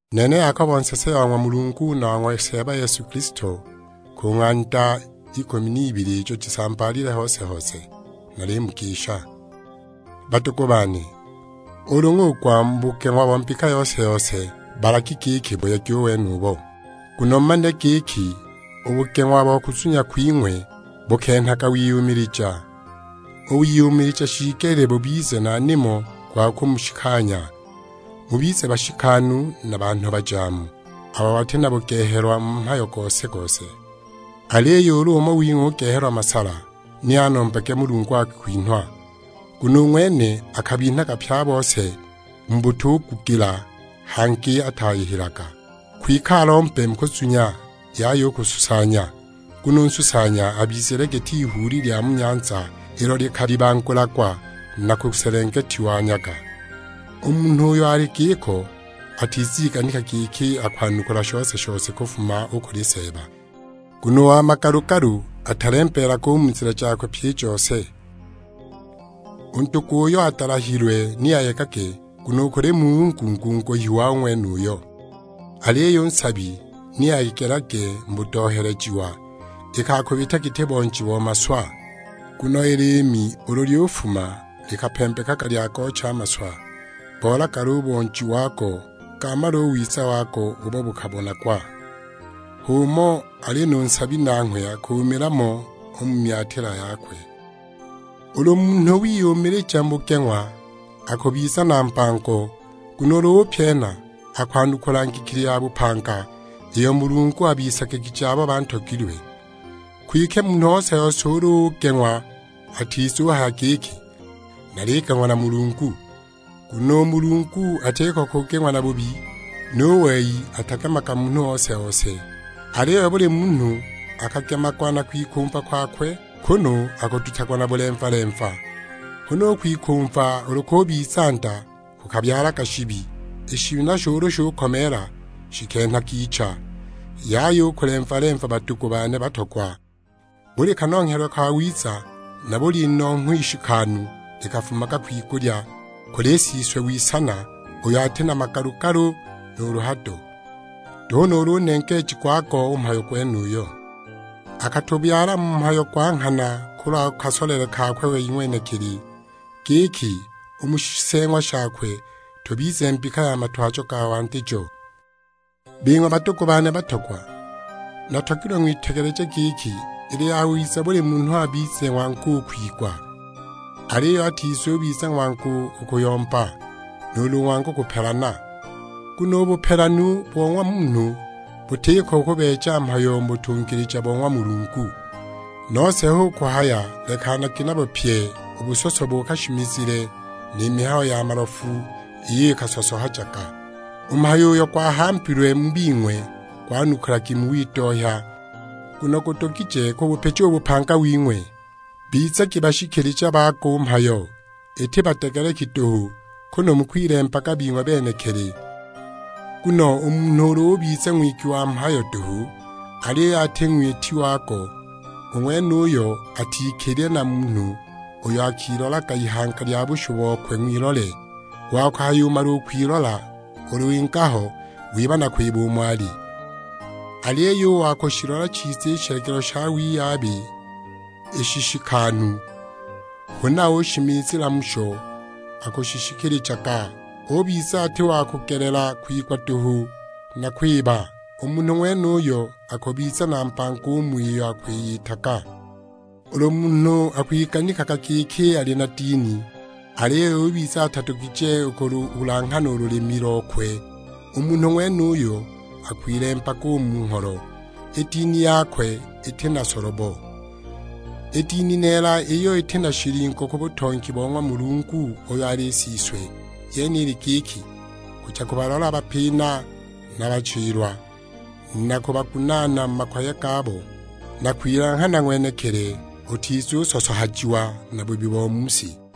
Nene Yakobo, nsese wa ng'wa Mulungu na wa ng'wa Seeba Yesu Kilisto, ku ng'anda ikumi n'ibili ijo jisambaalile hose-hose: Nalimugisha. Badugu bane, ulu ng'ugwa mu bugeng'wa bo mbika yose-yose, balagi giki buyegi u wenubo. Nguno mumanile giki, u bugeng'wa bo kuzunya kwing'we bukenhaga wiyumilija. U wiyumilija shiigelile bubize na nimo gwa kumushikanya, mubize bashikanu na banhu bajaamu, abo bati na bugehelwa mu mhayo gose-gose. Aliyo ulu umo wing'we ugehelwa masala, ni anombage Mulungu akwinhwa, nguno u ng'wene akabinhaga pye a bose mu butugugila, hangi ataayihilaga. Kwike alombe mu kuzunya, yaya u kususanya; nguno u nsusanya abizile giti ihuuli lya mu nyanza, ilo likalibangulagwa na kuselengetiwa nyaga. U munhu uyo ali giko atiziganika giki akwanukula shose-shose kufuma u kuli Seeba. Nguno u wa magalu-galu atalembeelaga u mu nzila jakwe pyi i jose. U ndugu uyo adalahilwe ni ayegage, nguno u kuli Mulungu ngunguhiwa u ng'wenuyo. Aliyo u nsabi ni ayegelage mu budohelejiwa, iki akubita giti bonji bo maswa. Nguno i liimi ulu lyufuma likapembekaga lyagoocha a maswa, bolagala u bonji wago, gaamala u wiza wago ubo bukabonagwa; h'umo ali nu nsabi, nanghwe akuumila mo u mu myatila yakwe! Ulu munhu wiyumilija mu bugeng'wa, akubiza na mbango, nguno ulu upyena, akwanukula ngikili ya bupanga, iyo Mulungu abisagigije abo bantogilwe. Kwike munhu ose-ose ulu ugeng'wa atizuhaya giki, "Naligeng'wa na Mulungu," nguno u Mulungu atiko kugeng'wa na bubi, nu wei atagemaga munhu ose-ose. Aliyo buli munhu akagemagwa na kwikumva kwakwe, kunu akudutagwa na bulemva-lemva. Huna u kwikumva ulu kubiza nda kukabyalaga shibi, i shibi nasho ulu shukomeela shikenhaga icha. Yaya u kulemva-lemva badugu bane batogwa; buli kanonghelwe kawiza, na buli inongho ishikanu likafumaga kwigulya, kuli Siswe w'isana, uyo ati na magalu-galu nuulu hado; nduhu nuulu nengeeji gwago u mhayo gwenuyo. Akatubyala mu mhayo gwa nghana kulwa kasolele kakwe wei ng'wenekili, giki u mu shiseeng'wa shakwe tubize mbika ya matwajo ga wandijo. Bing'we badugu bane batogwa, natogilwe ng'witegeleje giki, ili yawiza buli munhu abize ng'wangu u kwigwa, aliyo atizubiza ng'wangu u kuyomba, nuulu ng'wangu kupelana. Nguno u bupelanu bo ng'wa munhu butiko kubeeja mhayo mu butungilija bo ng'wa Mulungu. Nose hu kuhaya lekanagi nabo pyi u busoso bo kashimizile, ni mihayo ya malofu iyo ikasosohajaga. U mhayo uyo gwahambilwe mu bing'we gwanukulagi mu widohya, nguno gudugije kubupija u bupanga wing'we. Bizagi bashikilija bago u mhayo, iti badegeleki duhu; kunu mukwilembaga bing'we benekili. Nguno u munhu ulu ubiza ng'wigwi wa mhayo duhu, aliyo ati ng'witi wago, u ng'wenuyo atikilile na munhu uyo akilolaga ihanga lya bushu bokwe ng'wilole. Wa kuhayumala u kwilola, ulu winga ho wiba na kwiba umo ali! Aliyo u wa kushilola chiza i shilagilo sha wiyabi i shishikanu, huna ushimizila musho akushishikilijaga, ubiza ati wa kugelela kwigwa duhu na kwiba, u munhu ng'wenuyo akubiza na mbango u mu iyo akwiyitaga. Ulu munhu akwiganikaga giki ali na dini, aliyo ubiza atadugije u kululanghana u lulimi lokwe, u munhu ng'wenuyo akwilembaga u mu ngholo; i dini yakwe iti na solobo. I dini neela, iyo iti na shilingo ku butongi bo ng'wa Mulungu uyo ali Siswe, yene ili giki: kuja kubalola bapina na bachilwa, na kubagunaana mu makoye gabo. Na kwilanghana ng'wenekili utizusosohajiwa na bubi bo mu si.